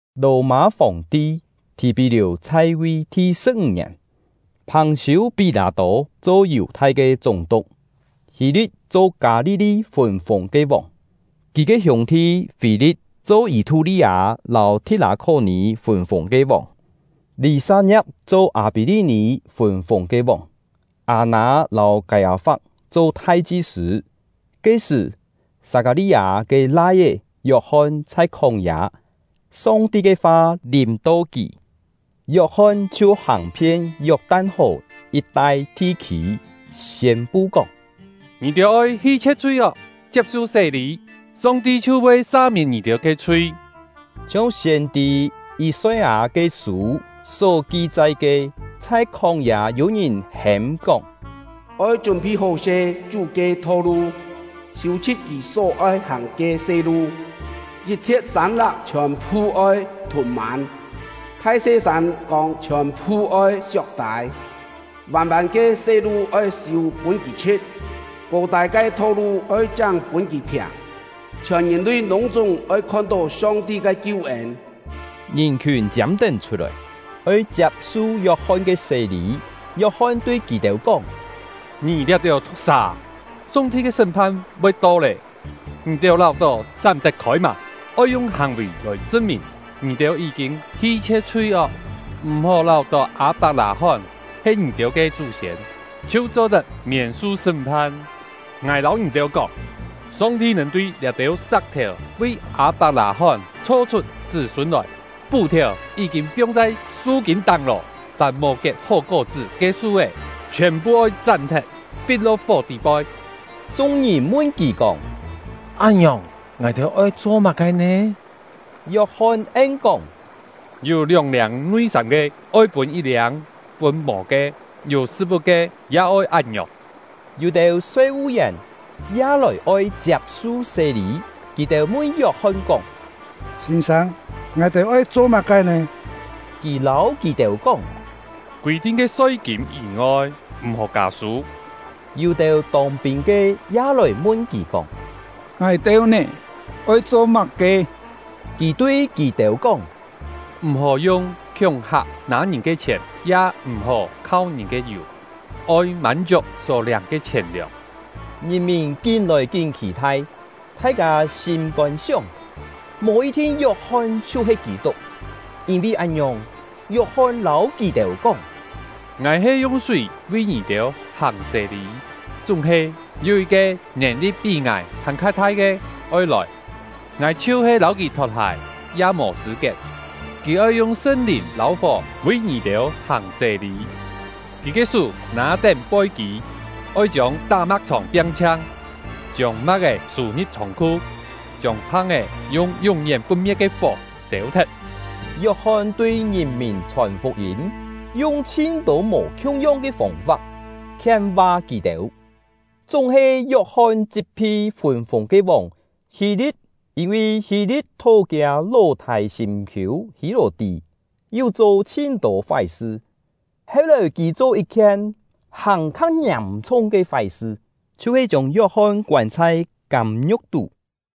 Lò-mâ Fòng-ti Thì-pí-liù chhai-vi thi-sṳ̍p-ńg ngièn, Phàng-siû-Pí-lâ-tô cho Yù-thai ke chúng-tuk, Hî-li̍t cho Kâ-li-li fûn-fûng ke vòng, kì ke hiûng-thi Fî-li̍t cho Yî-thú-li-â lâu Thi̍t-lâ-khó-nì fûn-fûng ke vòng, Lî-sat-ngiap cho Â-pí-li-nì fûn-fûng ke vòng, Â-nâ lâu Kâi-â-fap cho thai-chi-sṳ̂. Ke-sṳ̀, Sat-kâ-li-â ke lai-é Yok-hon chhai khóng-yâ, Song-ti ke fa lìm-to kì. Yok-hon chhiu hàng-phien Yok-tan-hò yit-tai thi-khî, siên-pu kóng: “Ngì-têu oi hi-chhie̍t chhui-ok, chiap-su sé-lî, Song-ti chhiu voi sa-miên ngì-têu ke chhui.” Chhiong siên-tî Yî-soi-â ke sû só ki-chai ke: Chhai khóng-yâ yû-ngìn hêm-kóng: “Oi chún-phi hó-se Chú ke tho-lu, siû-chhṳ̍t Kì só-oi hàng ke se-lu! Yit-chhiet sân-lak chhiòn-phu oi thùn-mân, thai-se sân-kông chhiòn-phu oi siok-tâi! Vân-vân ke se-lu oi siû pûn kì chhṳ̍t; kô-tâi ke tho-lu oi cháng pûn kì phiàng! Chhiòn ngìn-lui lûng-chúng voi khon-tó Song-ti ke kiu-ên!” Ngìn-khiùn chiâm-tén chhut-lòi, oi chiap-su Yok-hon ke sé-lî. Yok-hon tui kì-têu kóng: “Ngì liá-têu thu̍k-sà â! Song-ti ke sṳ́m-phan voi to lé, ngì-têu láu-tó sám tet-khôi mâ? Oi yung hàng-vì lòi chṳn-mìn ngì-têu yí-kîn hi-chhie̍t chhui-ok. M̀-hó láu-tó Â-pak-lâ-hón he ngì-têu ke chú-siên chhiu cho-tet miên-su sṳ́m-phan. Ngài lâu ngì-têu kóng, Song-ti nèn tui liá-têu sa̍k-thèu vi Â-pak-lâ-hón chho-chhut chṳ́-sûn lòi! Pú-thèu yí-kîn piong chhai su-kîn táng lô, fàm mò kiet hó kó-chṳ́ ke su-é chhiòn-phu oi chám-thet, fit-lo̍k fó tî-poi.” Chung-ngìn mun kì kóng: “Án-ngiòng, ngài-têu oi cho má-ke nè?” Yok-hon en-kóng: “Yû lióng-liâng nui-sâm ke, oi pûn yit-liâng pûn mò ke; yû sṳ̍t-vu̍t ke, ya oi án-ngiòng.” Yû-têu soi-vu-yèn ya lòi oi chiap-su sé-lî; kì-têu mun Yok-hon kóng: “Sîn-sâng, ngài-têu oi cho má-ke nè?” Kì lâu kì-têu kóng: “Kûi-thin ke soi-kîm yî-ngoi, m̀-hó kâ-sû.” Yû-têu tông-pîn ke ya lòi mun kì kóng: “Ngài-têu nè? Oi cho má-ke?” Kì tui kì-têu kóng: “M̀-hó yung khiúng-hak nâ ngìn ke chhièn, ya m̀-hó khau ngìn ke yù; oi mân-chiuk só liâng ke chhièn-liòng.” Ngìn-mìn kín-lòi kín khì-thai, thai-kâ sîm-kôn sióng, mò yit-thin Yok-hon chhiu-he Kî-tuk. Yîn-vi án-ngiòng, Yok-hon lâu kì-têu kóng: “Ngài he yung súi vi ngì-têu hàng sé-lî; chúng-he, yû yit-ke nèn-li̍t pí ngài hàn-kha thai ke oi lòi, ngài chhiu-he lâu kì thot-hài ya mò chṳ̂-kiet. Kì oi yung Sṳn-Lìn lâu fó vi ngì-têu hàng sé-lî. Kì ke sú nâ-tén poi-kî, oi chiông tá-ma̍k-chhòng piang-chhiang, chiông ma̍k-é sû-ngi̍p chhông-khu, chiông phang-é yung yún-yén put-me̍t ke fó sêu-thet.” Yok-hon tui ngìn-mìn chhòn fuk-yîm, yung chhin-tô mò khiung-yong ke fông-fap khien-va kì-têu. Chúng-he Yok-hon chit-phi fûn-fûng ke vòng Hî-li̍t, yîn-vi Hî-li̍t thó kiâ ló-thâi sîm-khiû Hî-lò-tí, yu cho chhin-tô fái-sṳ. Heu-lòi kì cho yit-khien hàn-kha ngiàm-chhung ke fái-sṳ, chhiu-he chiông Yok-hon koân chhai kâm-ngiu̍k tú.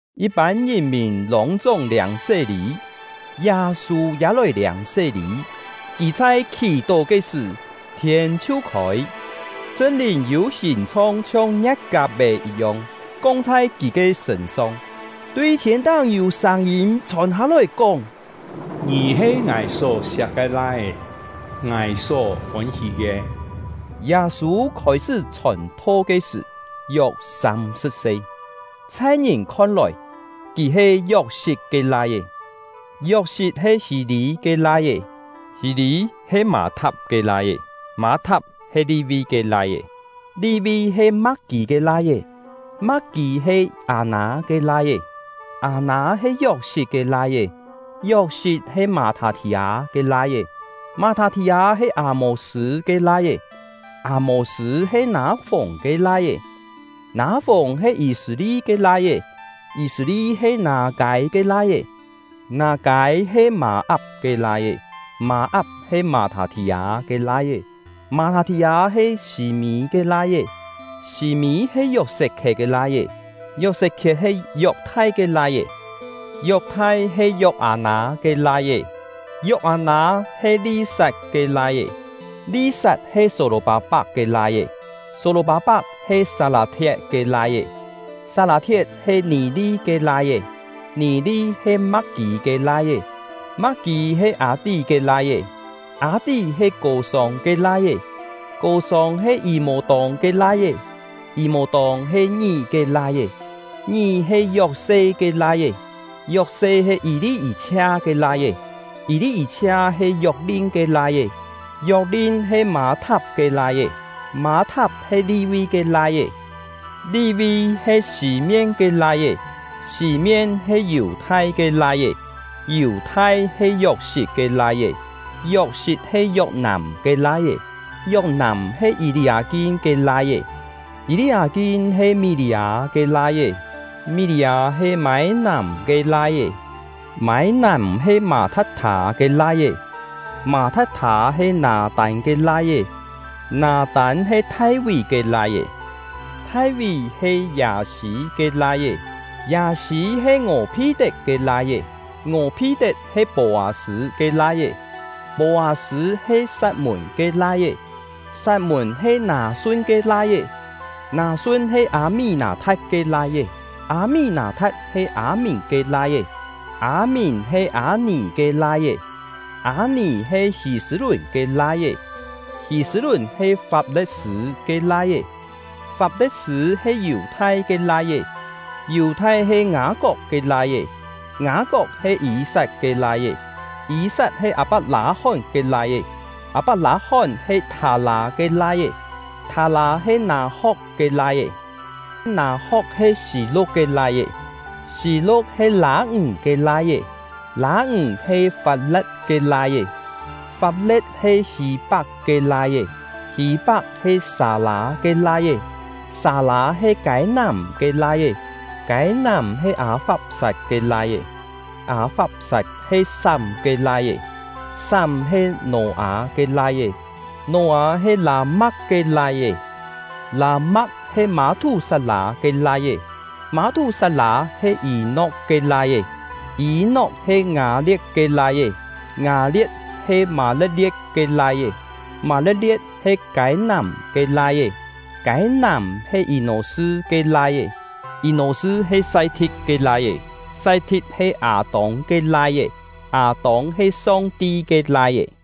Yit-pân ngìn-mìn lûng-chúng liâng sé-lî, Yâ-sû ya lòi liâng sé-lî. Kì chhai khì-tó ke sṳ̀, thiên chhiu khôi, Sṳn-Lìn yû hìn-chhong chhiong ngie̍t-kap-è yit-yong, kong chhai kì ke sṳ̂n-song. Tui thiên-táng yû sâng-yîm chhòn hâ-lòi, kóng: “Ngì he Ngài só-siak ke Lai-é, Ngài só fôn-hí ke.” Yâ-sû khôi-sṳ́ chhòn-tho ke sṳ̀, yok sâm-sṳ̍p se. Chhai ngìn khon-lòi, kì he Yok-sit ke lai-é, Yok-sit he Hî-lî ke lai-é, Hî-lî he Mâ-thap ke lai-é, Mâ-thap he Li-vi ke lai-é, Li-vi he Ma̍k-kî ke lai-é, Ma̍k-kî he Ngâ-nâ ke lai-é, Ngâ-nâ he Yok-sit ke lai-é, Yok-sit he Mâ-thâ-thì-â ke lai-é, Mâ-thâ-thì-â he Â-mô-sṳ̂ ke lai-é, Â-mô-sṳ̂ he Nâ-fùng ke lai-é, Nâ-fùng he Yî-sṳ̂-li ke lai-é, Yî-sṳ̂-li he Nâ-kâi ke lai-é, Nâ-kâi he Mâ-ap ke lai-é, Mâ-ap he Mâ-thâ-thì-â ke lai-é, Mâ-thâ-thì-â he Sî-mî ke lai-é, Sî-mî he Yok-set-khiet ke lai-é, Yok-set-khiet he Yok-thai ke lai-é, Yok-thai he Yok-â-nâ ke lai-é, Yok-â-nâ he Li-sat ke lai-é, Li-sat he Só-lò-pâ-pak ke lai-é, Só-lò-pâ-pak he Sat-lâ-thiet ke lai-é, Sat-lâ-thiet he Nì-li ke lai-é, Nì-li he Ma̍k-kî ke lai-é, Ma̍k-kî he Â-tí ke lai-é, Â-tí he Kô-sông ke lai-é, Kô-sông he Yî-mô-tông ke lai-é, Yî-mô-tông he Ngí ke lai-é, Ngí he Yok-se ke lai-é, Yok-se he Yî-li-yî-chhia ke lai-é, Yî-li-yî-chhia he Yok-lin ke lai-é, Yok-lin he Mâ-thap ke lai-é, Mâ-thap he Li-vi ke lai-é, Li-vi he Sî-mién ke lai-é, Sî-mién he Yù-thai ke lai-é, Yù-thai he Yok-sit ke lai-é, Yok-sit he Yok-nàm ke lai-é, Yok-nàm he Yî-li-â-kin ke lai-é, Yî-li-â-kin he Mí-li-â ke lai-é, Mí-li-â he Mâi-nàm ke lai-é, Mâi-nàm he Mâ-tha̍t-thâ ke lai-é, Mâ-tha̍t-thâ he Nâ-tân ke lai-é, Nâ-tân he Thai-ví ke lai-é, Thai-ví he Yâ-sî ke lai-é, Yâ-sî he Ngò-phi-tet ke lai-é, Ngò-phi-tet he Pô-â-sṳ̂ ke lai-é, Pô-â-sṳ̂ he Sat-mùn ke lai-é, Sat-mùn he Nâ-sun ke lai-é, Nâ-sun he Â-mí-nâ-tha̍t ke lai-é, Â-mí-nâ-tha̍t he Â-mìn ke lai-é, Â-mìn he Â-nì ke lai-é, Â-nì he Hî-sṳ̂-lùn ke lai-é, Hî-sṳ̂-lùn he Fap-le̍t-sṳ̂ ke lai-é, Fap-le̍t-sṳ̂ he Yù-thai ke lai-é, Yù-thai he Ngâ-kok ke lai-é, Ngâ-kok he Yî-sat ke lai-é, Yî-sat he Â-pak-lâ-hón ke lai-é, Â-pak-lâ-hón he Thâ-lâ ke lai-é, Thâ-lâ he Nâ-ho̍k ke lai-é, Nâ-ho̍k he Sî-lu̍k ke lai-é, Sî-lu̍k he Lâ-ǹg ke lai-é, Lâ-ǹg he Fap-le̍t ke lai-é, Fap-le̍t he Hî-pak ke lai-é, Hî-pak he Sâ-lâ ke lai-é, Sâ-lâ he Kâi-nàm ke lai-é, Kâi-nàm he Â-fap-sat ke lai-é, Â-fap-sat he Sám ke lai-é, Sám he Nò-â ke lai-é, Nò-â he Lâ-ma̍k ke lai-é, Lâ-ma̍k he Mâ-thú-sat-lâ ke lai-é, Mâ-thú-sat-lâ he Yî-nok ke lai-é, Yî-nok he Ngâ-lie̍t ke lai-é, Ngâ-lie̍t he Mâ-le̍t-lie̍t ke lai-é, Mâ-le̍t-lie̍t he Kâi-nàm ke lai-é, Kâi-nàm he Yî-nò-sṳ ke lai-é, Yî-nò-sṳ he Sai-thi̍t ke lai-é, Sai-thi̍t he Â-tông ke lai-é, Â-tông he Song-ti ke lai-é.